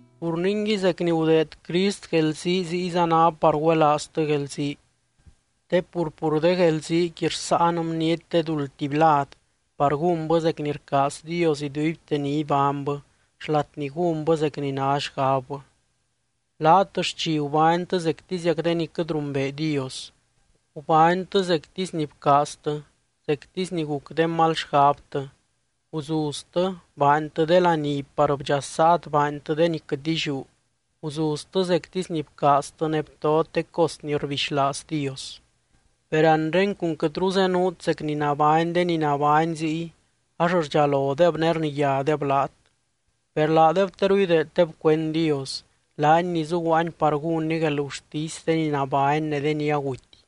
Pur ningui, zec ni gudeed Crist guelzii ziyza ná par güelaaztɨ guelzii. Te pur, pur de guelziiqui rsáan bniety de duld tuby lad par gúnbɨ zec ni rcaaz Dios iduibte ni ibánybɨ, xlat ni gúnbɨ zec ni ná xgabbɨ. Laat xchi gubánytɨ zectiziac de ni quɨt rumbee Dios. Gubánytɨ zectisy ni bcaaztɨ, zectisy ni guc de mal xgabtɨ, guzuztɨ, baantɨ de laní par bdxasaat baantɨ de ni quɨt illiú, guzuztɨ zectisy ni bcaaztɨ ne btot de cos ni rbixlaaz Dios. Per anre cun quɨtru zenuut zec ni nabány de ni nabány ziy, ax rdxalodeb ne rniyádeb laat. Per laadeb teru ideeddeb cuend Dios, laany ni zuguaany par gúnny guelgurtisy de ni nabány ne de ni aguty.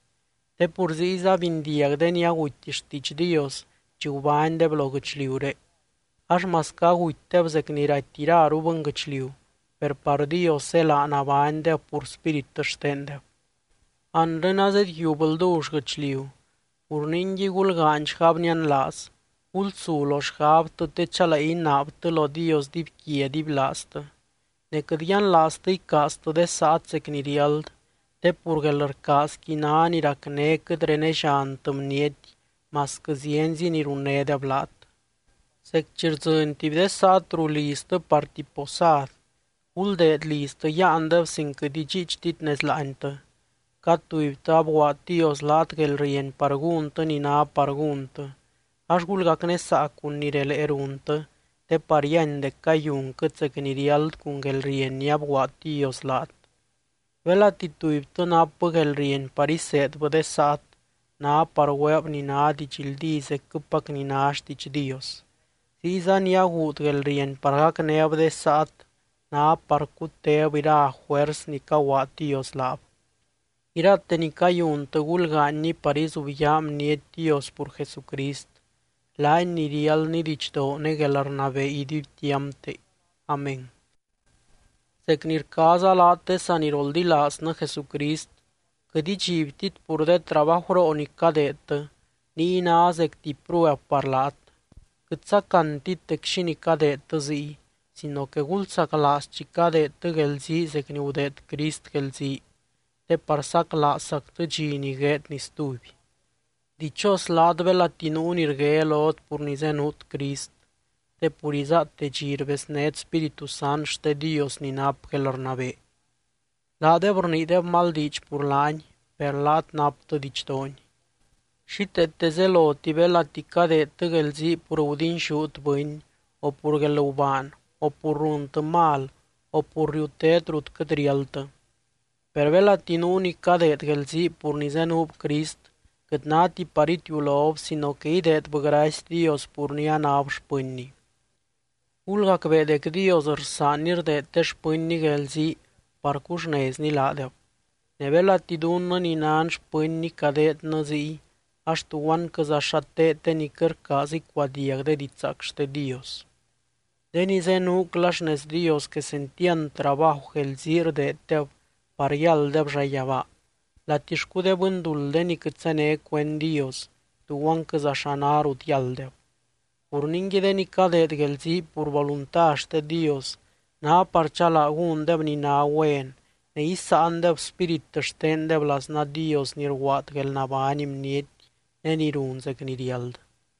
Te pur ziyza bindiag de ni aguty xtiidx Dios chi gubánydeb lo guɨchliuré ax masquɨ agutydeb zec ni raty iraru bɨnguɨchliu, per par Dios zélaa nabánydeb pur spírit xtendeb. Anre azedyiub ldull guɨchliu, pur ningui gulgaany xgab nianlaaz, gulsu lo xgabtɨ te chalee inaabtɨ lo Dios dibyquia dibylaaztɨ. Ne quɨt yianlaaztɨ icaaztɨ de saat zec ni riáld, te pur guelrcaazqui ná ni racné quɨt renelliantɨ bniety masquɨ zienzi ni runnédeb laat. Zec chi rdzɨny tuby de saat ruu liztɨ par tuby posad, guldeed liztɨ yáandeb sin quɨt idxiichtit nez láantɨ. Cad tubytɨ abguaad Dios laat guelrieny par gúntɨ ni ná par gúntɨ, ax gulgacnésaa cun ni relee runtɨ te par yíany dec cayunquɨt zec ni riáld cun guelrieny ni abguaad Dios laat. Belati tubytɨ napbɨ guelrieny par iseedbɨ de saat, ná par güeeb ni ná didxldí zecquɨpac ni ná xtiidx Dios. Ziyza ni aguud guelrieny par gacnéb de saat ná par cutéb ira juers ni caguaad Dios laab. Irate ni cayuntɨ gulgaanyni par izubyaa bniety Dios pur Jesucrist, laany ni riáldny didxdoo ne guelrnabee iduibtiampte. Amén. Zec ni rcaaza laat de saniroldilaaznɨ Jesucrist, quɨt idxibtit pur de trabajuroo ni cadeedtɨ niy ná zec tuby prueb par laat. Quɨt sacantit dec xínii cadeedtɨ ziy sino que gulsaclaaz chi cadeedtɨ guelzii zec ni gudeed Crist guelzii, te par saclaazzactɨ dxi ni gueedny stuby. Dichos laat belati nuu ni rgué lot pur ni zenuut Crist, te pur izáate dxi rbeznét Spíritu Sant xte Dios ni nap guelrnabee. Laadeb rniideb mal diidx pur laany, per laat naptɨ didxdoony. Xíteete zeloti belati cadeedtɨ guelzii pur gudinxút bɨny, o pur guelgubaan, o pur runtɨ mal, o pur riutét rut quɨt riáldtɨ. Per belati nuu ni cadeed guelzii pur ni zenuub Crist, quɨt náti par itiulob sino que ideedbɨ gracy Dios pur ni anáb xpɨnny. Gulgacbee dec Dios rsaanny rdeed de xpɨnny guelzii par cuxnezny laadeb. Ne belati dunnɨ ni nan xpɨnny cadeednɨ ziy ax, ¿tuguanquɨza xa teed de ni quɨt rcaaz icuadiag de didxzaac xte Dios? De ni zenuucla xnez Dios quesentiand trabaju guelzii rdeeddeb par yálddeb llayabaa, latixcu de bɨnduld de ni quɨt zéne cuend Dios, ¿tuguanquɨza xa ná rut yálddeb? Pur ningui de ni cadeed guelzii pur volunta xte Dios, ná par chalaa gúndeb ni ná güen ne isáandeb spírit xtendeb laznaa Dios ni rguaad guelnabány bniety ne ni run zec ni riáld.